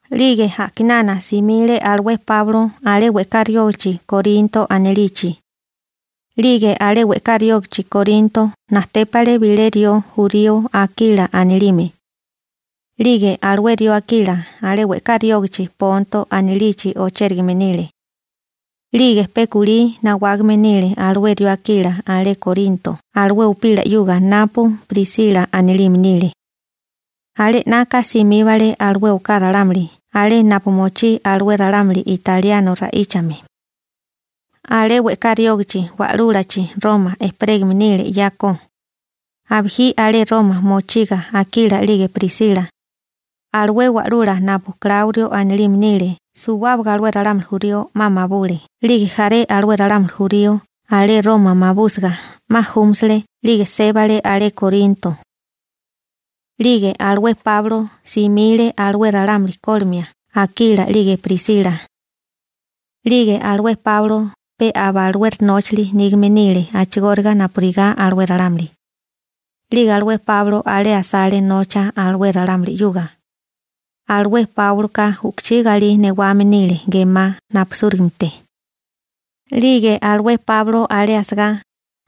'Lige a'kinana simile alué Páulo alé we'ká riógichi Korinto anilichi. 'Lige alé we'ká riógichi Korinto najtépale bilé rió jurío Akila anilime. 'Lige alué rió Akila alé we'ká riógichi Ponto anilichi ochérigame nile. 'Lige pe kulí nawágame nile alué rió Akila alé Korinto alué upila 'yuga napu Prisila anilime nile. Alé 'naka simíbale alué oká ralámuli alé napu mochí alué ralámuli italiano ra'íchame. Alé we'ká riógichi wa'lúlachi Roma ejperégame nile 'yako. Abijí alé Roma mochiga Akila 'lige Prisila, alué wa'lula napu Kláurio anilime nile suwábaga alué ralámuli jurío 'ma mabule, 'lige jaré alué ralámuli jurío alé Roma mabúsiga 'ma júmasile 'lige sébale alé Korinto. 'Lige alué Páulo simile alué ralámuli kólimia Akila 'lige Prisila. 'Lige alué Páulo pe aba alué nóchili nígame nile a'chigóriga napurigá alué ralámuli. 'Lige alué Páulo alé asale nocha alué ralámuli 'yuga. Alué Páuloka u'kuchí galí newame nile gemá napisúligamete. 'Lige alué Páulo alé asagá,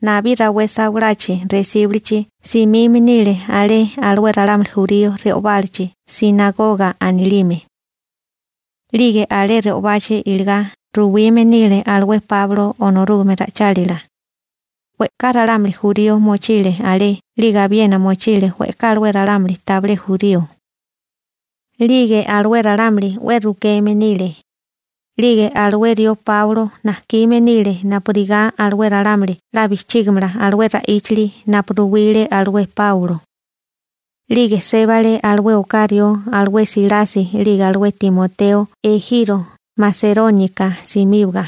nabí rawé sawalachi resíbulichi simime nile alé alué ralámuli jurío re'obálachi «sinagoga» anilime. 'Lige alé re'obachi iligá ruwime nile alué Páulo Onorúgame ra'ichálila. We'ká ralámuli jurío mochile alé 'lige abiena mochile we'ká alué ralámuli tabilé jurío. 'Lige alué ralámuli 'we rukeme nile. 'Lige alué rió Páulo najkime nile napurigá alué ralámuli 'la bijchígimala alué ra'íchili napu ruwile alué Páulo. 'Lige sébale alué oká rió alué Silasi 'lige alué Timoteo ejiro Maseróniaka simíbaga.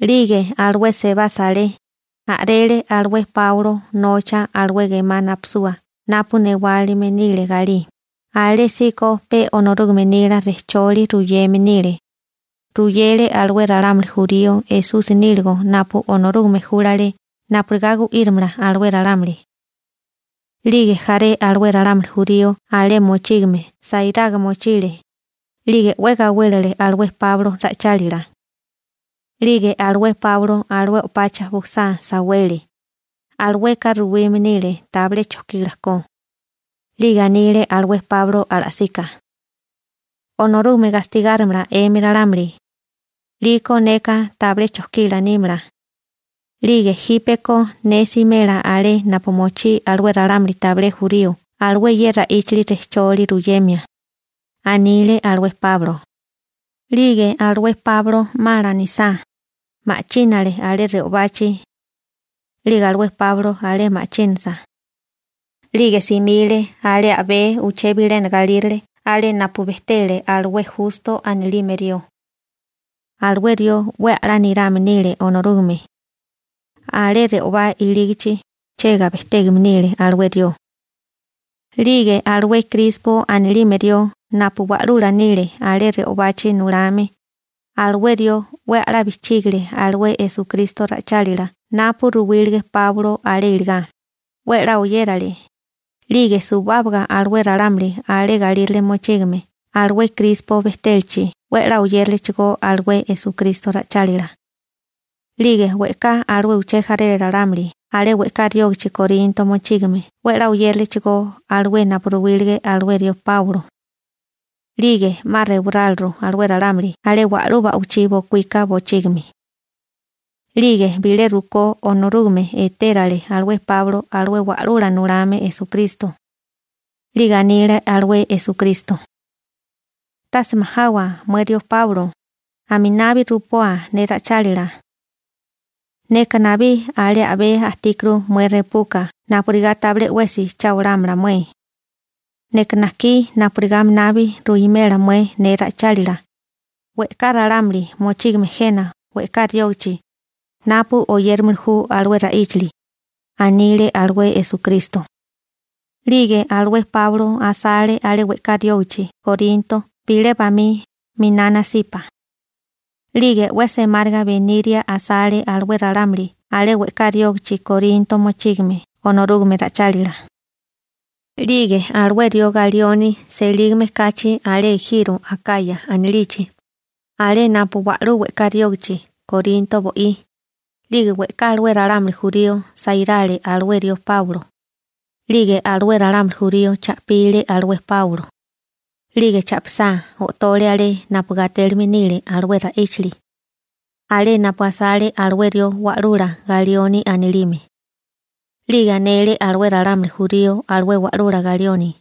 'Lige alué sebasa alé, a'rele alué Páulo nocha alué gemá napisua napu newalime nile galí, alésíko pe Onorúgame nila rejcholi ruyeme nile. Ruyele alué ralámuli jurío Esusi níligo napu Onorúgame júlale napurigá gu'írimala alué ralámuli. 'Lige jaré alué ralámuli jurío alé mochígame sairaga mochile 'lige 'we gawélele alué Páulo ra'ichálila. 'Lige alué Páulo alué o'pacha bujasá sawele. Alueka ruwime nile tabilé chokila ko. 'Lige anile alué Páulo ala'sika: ―Onorúgame gastigárimala 'emi ralámuli, 'liko neka tabilé chokila nímala. 'Lige jípeko ne simela alé napu mochí alué ralámuli tabilé jurío alué ye ra'íchili rejcholi ruyemia ―anile alué Páulo. 'Lige alué Páulo 'ma lanisá, ma'chínale alé re'obachi. 'Lige alué Páulo alé ma'chínasa, 'lige simile alé a'bé uché bilena galírale alé napu bejtele alué Justo anilime rió. Alué rió 'we a'lá nirame nile Onorúgame. Alé re'obá ilígachi chega bejtégame nile alué rió. 'Lige alué Krispo anilime rió napu wa'lula nile alé re'obachi nulame, alué rió 'we a'lá bijchígile alué Esukristo ra'ichálila napu ruwílige Páulo alé iligá, 'we 'la oyérale, 'lige suwábaga alué ralámuli alé galírale mochígame alué Krispo bejtélachi 'we 'la oyéralechigó alué Esukristo ra'ichálila. 'Lige we'ká alué uché jaré ralámuli alé we'ká riógichi Korinto mochígame 'we 'la oyéralechigó alué napu ruwílige alué rió Páulo. 'Lige 'ma rewaráliru alué ralámuli alé wa'lú ba'wichí bokuíka bochígimi. 'Lige bilé rukó Onorúgame etérale alué Páulo alué Wa'lula Nulame Esukristo. 'Lige anile alué Esukristo: ―Tase majawa mué rió Páulo, aminabi rupoa ne ra'ichálila. Neka nabí alé a'bé ajtíkuru mué repuka napurigá tabilé 'wesi cha olámala mué. Neka najkí napurigá aminabi ruwimela mué ne ra'ichálila, we'ká ralámuli mochígame jena we'ká riógichi napu oyérimili ju alué ra'íchali ―anile alué Esukristo. 'Lige alué rió Páulo asale alé we'ká riógichi Korinto bilé bamí miná nasipa. 'Lige 'we semáriga beniria asale alué ralámuli alé we'ká riógichi Korinto mochígame Onorúgame ra'ichálila. 'Lige alué rió Galioni selígame kachi alé ejiro Akaya anilichi, alé napu wa'lú we'ká riógichi Korinto bo'í, 'lige we'ká alué ralámuli jurío sairale alué rió Páulo. 'Lige alué ralámuli jurío cha'pile alué Páulo, 'lige cha'pisá, o'tole alé napu gatélime nile alué ra'íchili, alé napu asale alué rió wa'lula Galioni anilime. 'Lige anele alué ralámuli jurío alué wa'lula Galioni: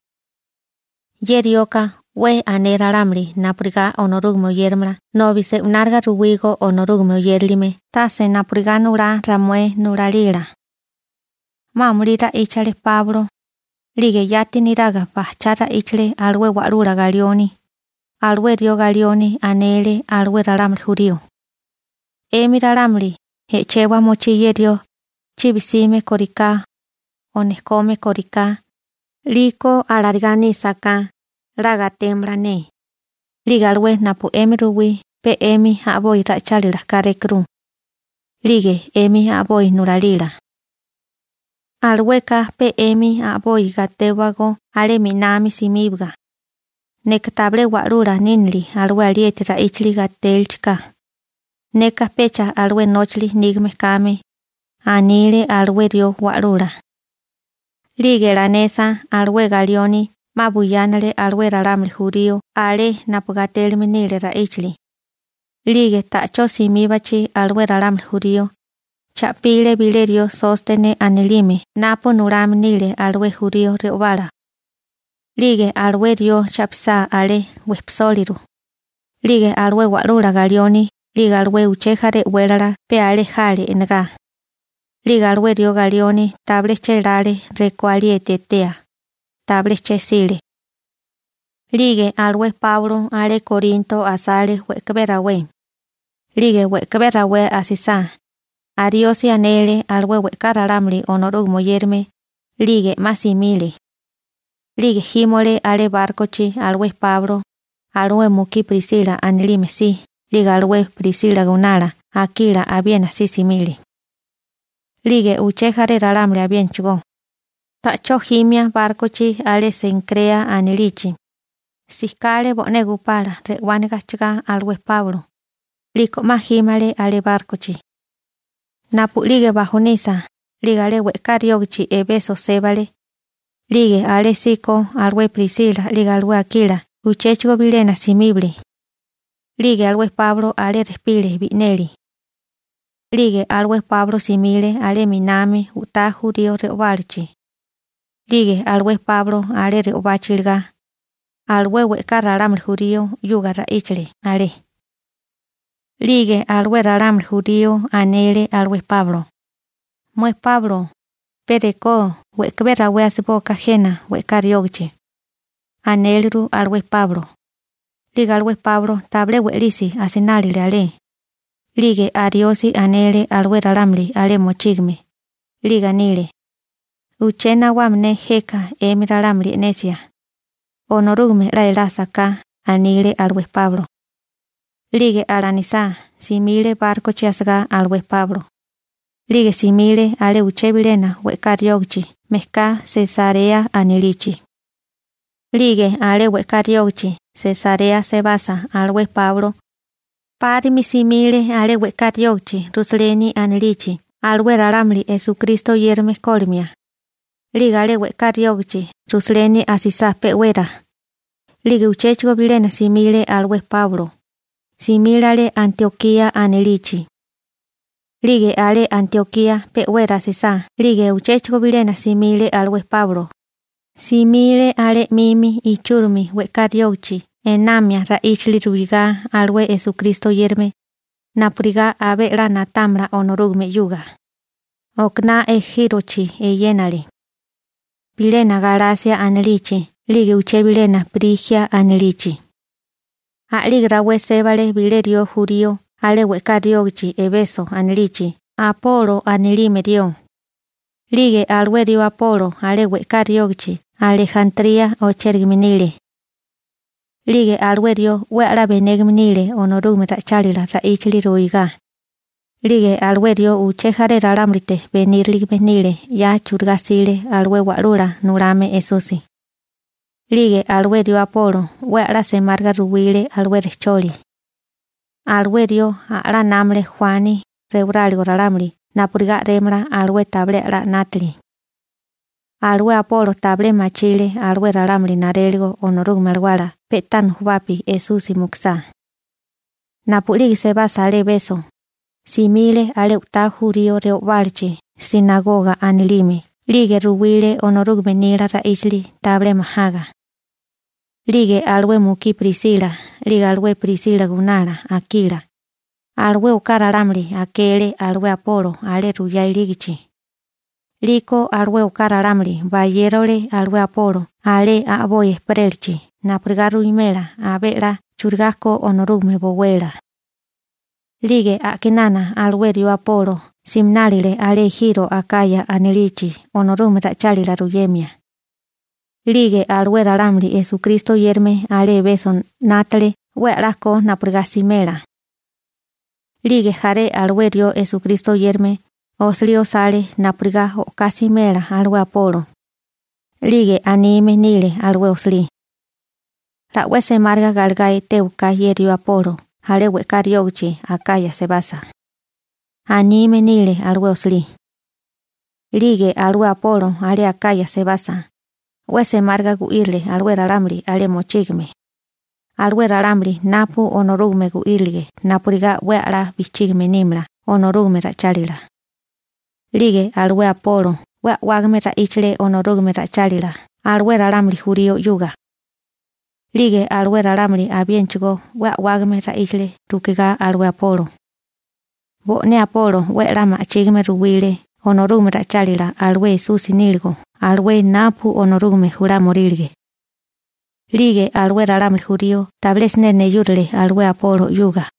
―Ye rioka 'we ané ralámuli napurigá Onorúgame oyéramala nobi se'unáriga ruwígó Onorúgame oyérilime tase napurigá nulá ramué nulalila. 'Ma amulí ra'íchale Páulo, 'lige yati neraga bajchá ra'íchale alué wa'lula Galioni. Alué rió Galioni anele alué ralámuli jurío: ―'Emi ralámuli e'chewa mochí ye rió chibi 'sime kóriká o nejkome kóriká, 'liko alarigá nísaká, 'la gatémala ne. 'Lige alué napu 'emi ruwí pe 'emi a'boi ra'ichálila kárékuru, 'lige 'emi a'boi nulalila. Alueka pe 'emi a'boi gatéwagó alé 'minami simíbaga. Neka tabilé wa'lula nínili alué alieti ra'íchili gatélichiká. Neka pecha alué nóchali nígame kame ―anile alué rió wa'lula. 'Lige lanesa, alué Galioni 'ma buyánale alué ralámuli jurío alé napu gatélime nile ra'íchali. 'Lige ta'chó simíbachi alué ralámuli jurío, cha'pile bilé rió Sóstene anilime napu nulame nile alué jurío re'obala. 'Lige alué rió cha'pisá alé, wejpisóliru. 'Lige alué wa'lula Galioni 'lige alué uché jaré e'wélala pe alé jale e'negá. 'Lige alué rió Galioni tabilé chélále rekó alieti etea, tabilé che'sile. 'Lige alué Páulo alé Korinto asale we'kabé rawé. 'Lige we'kabé rawé asisá, ariosi anele alué we'ká ralámuli Onorúgame oyérame, 'lige 'ma simile. 'Lige jímole alé bárkochi alué Páulo alué mukí Prisila anilime si, 'lige alué Prisila gunala Akila abiena si simile, 'lige uché jaré ralámuli abiénachigó. Ta'chó jimia bárkochi alé Senkrea anilichi, sikale bo'né gupala re'wániga ajchagá alué Páulo, 'liko 'ma jímale alé bárkochi. Napu'lige bajonisa, 'lige alé we'ká riógichi Ebeso sébale. 'Lige alésíko alué Prisila 'lige alué Akila uchéchigo bilena simíbale, 'lige alué Páulo alé rejpile bi'neli. 'Lige alué Páulo simile alé na'minami u'tá jurío re'obálachi. 'Lige alué Páulo alé re'obachi iligá, alué we'ká ralámuli jurío 'yuga ra'íchale alé. 'Lige alué ralámuli jurío anele alué Páulo: ―Mué Páulo, pe rekó we'kabé rawé asibóká jena we'ká riógichi ―anéleru alué Páulo. 'Lige alué Páulo tabilé we'lisi asinálile alé. 'Lige ariosi anele alué ralámuli alé mochígame, 'lige anile: ―Uché nawame ne jeka 'emi ralámuli e'nesia, Onorúgame 'la elásaká ―anile alué Páulo. 'Lige alanisá, simile bárkochi asagá alué Páulo. 'Lige simile alé uché bilena we'ká riógichi mejká Sesarea anilichi. 'Lige alé we'ká riógichi Sesarea sebasa alué Páulo, 'párimi simile alé we'ká riógichi Rusaleni anilichi alué ralámuli Esukristo oyérame kólimia. 'Lige alé we'ká riógichi Rusaleni asisá pe'wera, 'lige uchéchigo bilena simile alué Páulo. Simile alé Antiokía anilichi. 'Lige alé Antiokía pe'wera asisá 'lige uchéchigo bilena simile alué Páulo. Simile alé 'mimi ichúrimi we'ká riógichi enamia ra'íchali ruigá alué Esukristo oyérame napurigá abé 'la na'támala Onorúgame 'yuga. Okaná ejírochi eyénale, bilena Galasia anilichi 'lige uché bilena Prijia anilichi. A'lige rawé sébale bilé rió jurío alé we'ká riógichi Ebeso anilichi, Apolo anilime rió. 'Lige alué rió Apolo alé we'ká riógichi Alejantría ochérigame nile. 'Lige alué rió 'we a'lá benégame nile Onorúgame ra'ichálila ra'íchali ruigá. 'Lige alué rió uché jaré ralámulite beníriligame nile 'ya churigá 'sile alué Wa'lula Nulame Esusi. 'Lige alué rió Apolo 'we a'lá semáriga ruwile alué rejcholi. Alué rió a'lá námale Juani rewaráligo ralámuli napurigá a'rémala alué tabilé 'la 'nátili. Alué Apolo tabilé machile alué ralámuli naréligo Onorúgame Alawala pe'tá nujubapi Esusi mukusá. Napu'lige sebasa alé Ebeso, simile alé u'tá jurío re'obálachi «sinagoga» anilime 'lige ruwile Onorúgame nila ra'íchali tabilé majaga. 'Lige alué mukí Prisila 'lige alué Prisila gunala Akila, alué oká ralámuli akele alué Apolo alé ruyá ilígachi. 'Liko alué oká ralámuli bayérole alué Apolo alé a'boi ejperélachi napurigá ruwimela abé 'la churigá ko Onorúgame bowela. 'Lige a'kinana alué rió Apolo siminálile alé ejiro Akaya anilichi Onorúgame ra'ichálila ruyemia. 'Lige alué ralámuli Esukristo oyérame alé Ebeso 'nátale 'we 'la ko napurigá simela. 'Lige jaré alué rió Esukristo oyérame osilí osale napurigá o'ká simela alué Apolo. 'Lige anime nile alué osilí: «'La 'we semáriga galegá etéwaká ye rió Apolo alé we'ká riógichi Akaya sebasa», anime nile alué osilí. 'Lige alué Apolo alé Akaya sebasa, 'we semáriga gu'írile alué ralámuli alé mochígame, alué ralámuli napu Onorúgame gu'írilige napurigá 'we a'lá bijchígime nímala Onorúgame ra'ichálila. 'Lige alué Apolo 'we a'wágame ra'íchale Onorúgame ra'ichálila alué ralámuli jurío 'yuga. 'Lige alué ralámuli abiénachigó 'we a'wágame ra'íchale rukigá alué Apolo. Bo'né Apolo 'we a'lá ma'chígime ruwile Onorúgame ra'ichálila alué Esusi níligo alué napu Onorúgame julámiorílige. 'Lige alué ralámuli jurío tabilé siné neyúrale alué Apolo 'yuga.